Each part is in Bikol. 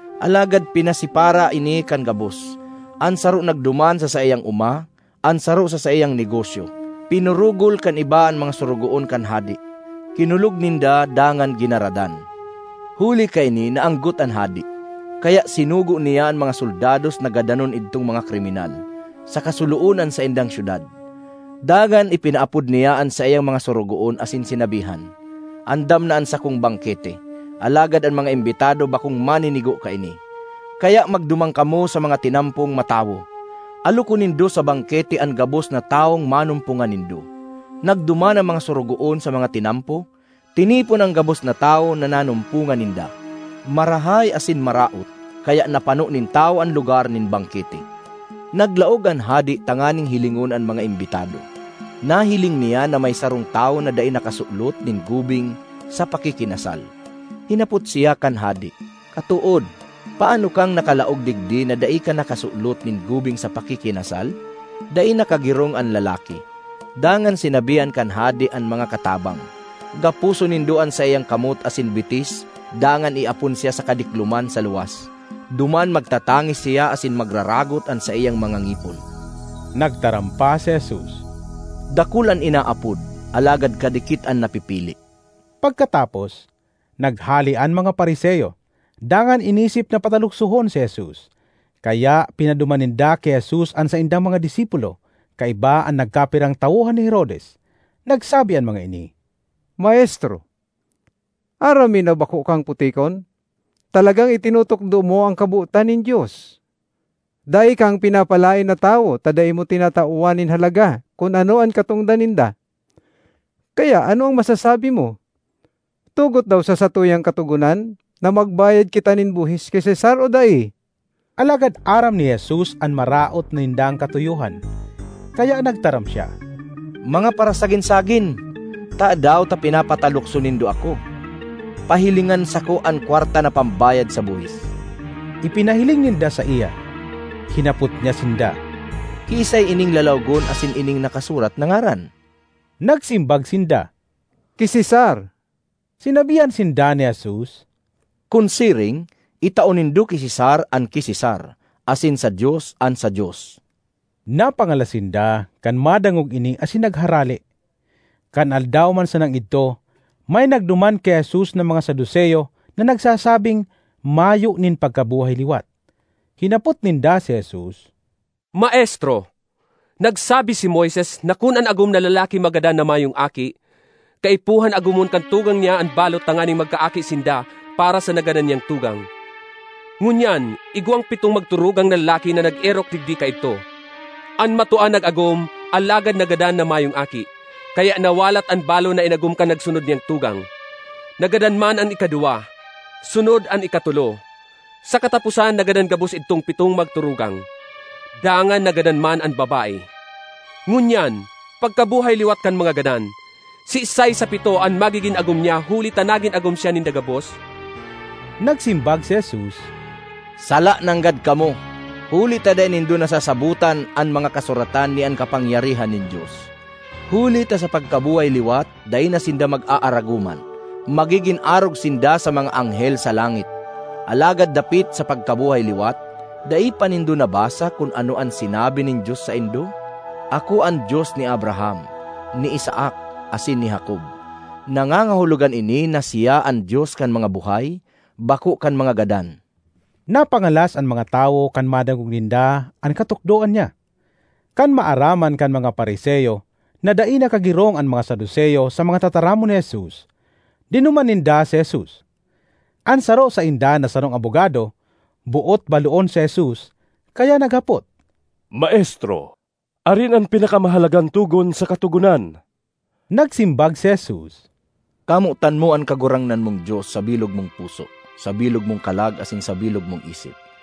Alagad pinasipara ini kan gabos: an saro nagduman sa saiyang oma, an saro sa saiyang negosyo. Pinurugol kan iba an mga sorogoon kan hade, kinulog ninda dangan ginaradan. Huli kaini naanggot an hade, kaya sinugo niya an mga soldados na gadanon idtong mga kriminal, saka suloon an saindang syudad. Dangan ipinaapod niya an saiyang mga sorogoon asin sinabihan, ‘Andam na an sakong bangkete, alagad an mga imbitado bakong maninigo kaini. Kaya magduman kamo sa mga tinampong matawo, alokon nindo sa bangkete an gabos na tawong manumpongan nindo.’ Nagduman an mga sorogoon sa mga tinampo, tinipon an gabos na tawo na nanumpongan ninda, marahay asin maraot; kaya napano nin tawo an lugar nin bangkete. ”Naglaog an hade tanganing hilingon an mga imbitado. Nahiling niya na may sarong tawo na dai nakasulot nin gubing sa pakikinasal. Hinapot siya kan hade, ‘Katood, paano kang nakalaog digdi na dai ka nakasulot nin gubing sa pakikinasal?’ Dai nakagirong an lalaki. Dangan sinabihan kan hade an mga katabang, ‘Gaposon nindo an saiyang kamot asin bitis dangan iapon siya sa kadikloman sa luwas. Duman magtatangis siya asin magraragot an saiyang mga ngipon.’” Nagtaram pa si Jesus, “Dakul an inaapod, alagad kadikit an napipili.” Pagkatapos, naghale an mga Fariseo dangan inisip na pataluksohon si Jesus. Kaya pinaduman ninda ki Jesus an saindang mga disipulo kaiba an nagkapirang tawohan ni Herodes. Nagsabi an mga ini, “Maestro, aram mi na bako kang putikon, talagang itinutukdo mo an kabotan nin Dios. Dai kang pinapalaen na tawo ta dai mo tinatawan nin halaga kun ano an katongdan ninda. Kaya ano an masasabi mo? Tugot daw sa satuyang Katogonan na magbayad kita nin buhis ki Cesar o dai?” Alagad aram ni Jesus an maraot nindang katuyohan, kaya nagtaram siya, “Mga parasagin-sagin! Tadaw ta pinapatalukso nindo ako? Pahilingan sako an kwarta na pambayad sa buhis!” Ipinahiling ninda saiya. Hinapot niya sinda, “Kiisay ining lalawogon asin ining nakasurat na ngaran?” Nagsimbag sinda, “Ki Cesar.” Sinabihan sinda ni Jesus, “Kun siring, itao nindo ki Cesar an ki Cesar asin sa Dios an sa Dios.” Napangalas sinda kan madangog ini asin nagharale. Kan aldaw man sanang idto, may nagduman ki Jesus na mga Saduceo na nagsasabing mayo nin pagkabuhay liwat. Hinapot ninda si Jesus, “Maestro, nagsabi si Moises na kun an agom na lalaki magadan na mayong aki, kaipuhan agomon kan tugang niya an balo tanganing magkaaki sinda para sa nagadan niyang tugang. Ngunyan, igwang pitong magturugang na lalaki na nag-erok digdi kaidto. An matua nag-agom alagad nagadan na mayong aki, kaya nawalat an balo na inagom kan nagsunod niyang tugang. Nagadan man an ikaduwa, sunod an ikatolo. Sa kataposan nagadan gabos idtong pitong magturugang. Dangan nagadan man an babae. Ngunyan, pagkabuhay liwat kan mga gadan, siisay sa pito an magigin agom niya huli ta nagin agom siya ninda gabos?” Nagsimbag si Jesus, “Sala nanggad kamo! Huli ta dai nindo nasasabotan an mga Kasuratan ni an kapangyarihan nin Dios. Huli ta sa pagkabuhay liwat dai na sinda mag-aaragoman; magigin arog sinda sa mga anghel sa langit. Alagad dapit sa pagkabuhay liwat, dai pa nindo nabasa kun ano an sinabi nin Dios saindo? ‘Ako an Dios ni Abraham, ni Isaac, asin ni Jacob.’ Nangangahulogan ini na siya an Dios kan mga buhay, bako kan mga gadan.” Napangalas an mga tawo kan madangog ninda an katukdoan niya. Kan maaraman kan mga Fariseo na dai nakagirong an mga Saduceo sa mga tataramon ni Jesus, dinuman ninda si Jesus. An saro sainda na sarong abogado, boot baloon si Jesus kaya naghapot, ”Maestro, arin an pinakamahalagang togon sa Katogonan?” Nagsimbag si Jesus, “‘Kamotan mo an Kagurangnan mong Dios sa bilog mong puso, sa bilog mong kalag, asin sa bilog mong isip.’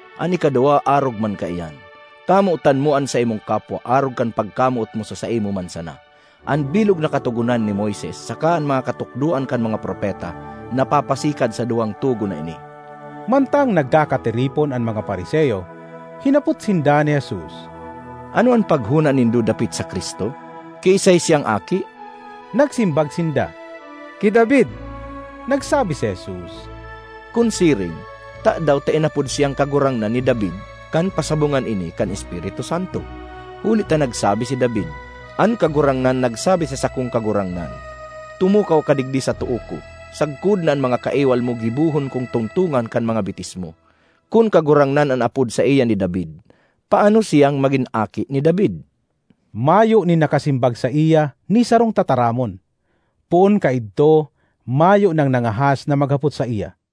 An ikaduwa arog man kaiyan: ‘Kamotan mo an saimong kapwa arog kan pagkamoot mo sa saimo man sana.’ An bilog na Katogonan ni Moises saka an mga katukdoan kan mga propeta napapasikad sa duwang togon na ini.” Mantang nagkakatiripon an mga Fariseo, hinapot sinda ni Jesus. ”Ano an paghona nindo dapit sa Cristo? Kiisay siyang aki?” Nagsimbag sinda, “Ki David.” Nagsabi si Jesus, “Kun siring, tadaw ta inapod siyang ‘Kagurangnan’ ni David kan pasabongan ini kan Espiritu Santo? Huli ta nagsabi si David, ‘An Kagurangnan nagsabi sa sakong Kagurangnan: Tumukaw ka digdi sa too ko, sagkod na an mga kaiwal mo gibohon kong tungtongan kan mga bitis mo.’ Kun Kagurangnan an apod saiya ni David, paano siyang magin aki ni David?” Mauyo (Mayo) nin nakasimbag saiya ni sarong tataramon; poon kaidto mayo nang nangahas na maghapot saiya.